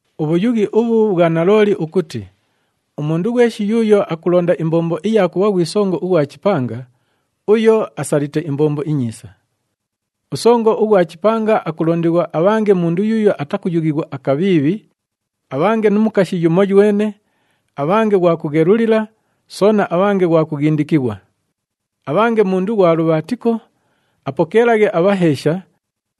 Ubhuyughi ubhu bhwa nalooli ukuti, “Umundu ghweshi yuuyo akulonda imbombo iya kubha ghwi songo ughwa chipanga, uyo asalite imbombo inyiisa.” Usongo ughwa chipanga akulondighwa abhange mundu yuuyo atakuyughighwa akabhiibhi, abhange nu mukashi yumoywene, abhange ghwa kughelulila soona abhange ghwa kughindikighwa. Abhange mundu ghwa lubhaatiko, apokeelaghe abhaheesha,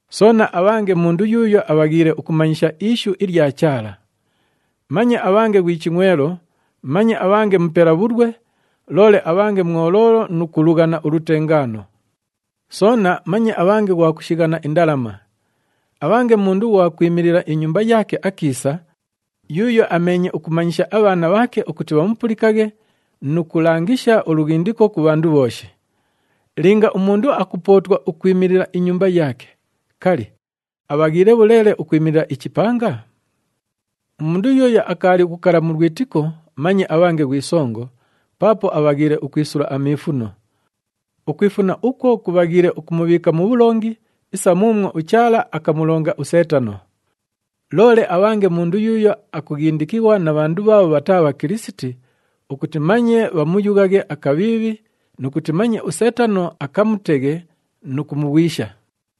soona abhange mundu yuuyo abhaghiile ukumanyisha ishu ilya Chaala. Manye abhange ghwi chingʼwelo, manye abhange mupela bhulwe, loole abhange mwoloolo nu kulughana ulutengaano. Soona manye abhange ghwa kushighana indalama. Abhange mundu ughwa kwimilila inyumba yaake akiisa, yuuyo ameenye ukumanyisha abhaana bhaake ukuti bhamupulikaghe nu kulangisha ulughindiko ku bhandu bhooshi. Linga umundu akupootwa ukwimilila inyumba yaake, kali, abhaghiile bhuleele ukwimilila ichipanga? Umundu yuuyo akaali ukukala mu lwitiko manye abhange ghwi songo, paapo abhaghiile ukwisula amiifuno. Ukwifuna ukwo kubhaghiile ukumubhiika mu bhulongi isa muumwo uChaala akamulonga uSeetano. Loole abhange mundu yuuyo akughindikighwa na bhandu bhaabho bhataa Bhakilisiti ukuti manye bhamuyughaghe akabhiibhi nu kuti manye uSeetano akamuteghe nu kumughwisha.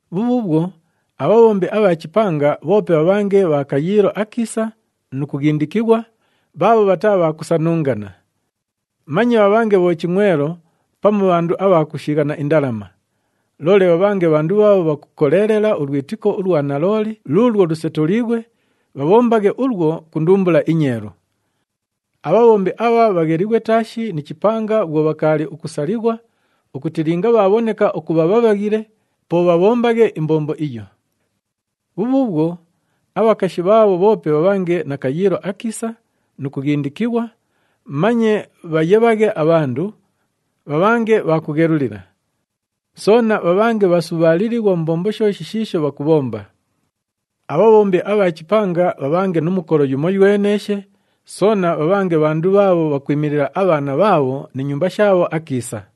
Bhubhuubhwo, abhabhombi abha chipanga bhoope bhabhange bha kayiilo akiisa nu kughindikighwa, bhaabho bhataa bha kusanungana. Manye bhabhange bhochingʼwelo pamu bhandu abha kushighana indalama. Loole bhabhange bhandu bhaabho bhakukoleelela ulwitiko ulwa nalooli luulwo lusetuliighwe, bhabhombaghe ulwo ku ndumbula inyeelu. Abhabhombi abha bhaghelighwe taashi ni chipanga bhwo bhakaali ukusalighwa ukuti linga bhaabhoneka ukubha bhabhaghile, po bhabhombaghe imbombo iyo. Bhubhuubhwo, abhakashi bhaabho bhoope bhabhange na kayiilo akiisa nu kughindikighwa, manye bhayebhaghe abhandu, bhabhange bha kughelulila. Soona bhabhange bhasubhaalilighwa mu mbombo shooshi shiisho bhakubhomba. Abhabhombi abha chipanga bhabhange nu mukolo yumoyweneeshe, soona bhabhange bhandu bhaabho bhakwimilila abhaana bhaabho ni nyumba shaabho akiisa.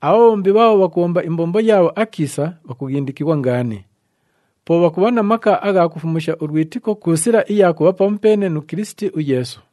Abhabhombi bhaabho bhakubhomba imbombo yaabho akiisa, bhakughindikighwa ngaani. Po bhakubha na maka agha kufumusha ulwitiko ku sila iya kubha pamupeene nu Kilisiti uYeesu.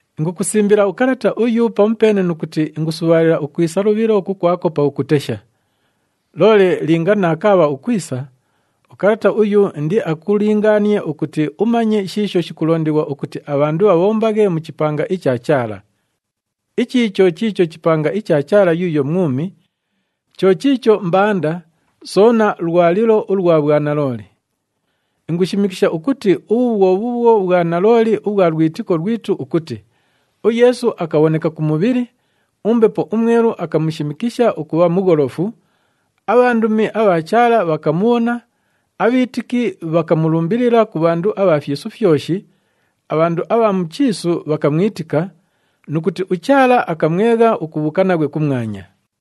Ingukusimbila ukalata uyu pamupeene nu kuti ingusubhaalila ukwisa lubhilo kukwako pakukutesha. Loole linga naakaabha ukwisa, ukalata uyu indiakulingaanie ukuti umanye shiisho shikulondighwa ukuti abhandu bhabhombaghe mu chipanga icha Chaala. Ichi cho chiicho chipanga icha Chaala yuuyo mwumi, cho chiicho mbanda soona lwalilo ulwa bhwanalooli. Ingushimikisha ukuti ubhu bhwo bhuubhwo bhwanalooli ubhwa lwitiko lwitu ukuti, UYeesu akabhoneka ku mubhili, uMbepo uMwelu akamushimikisha ukubha mugholofu, abhandumi abha Chaala bhakamubhona, abhiitiki bhakamulumbilila ku bhandu abha fyisu fyoshi, abhandu abha mu chiisu bhakamwitika, nu kuti uChaala akamwegha ukubhuuka naghwe kumwanya.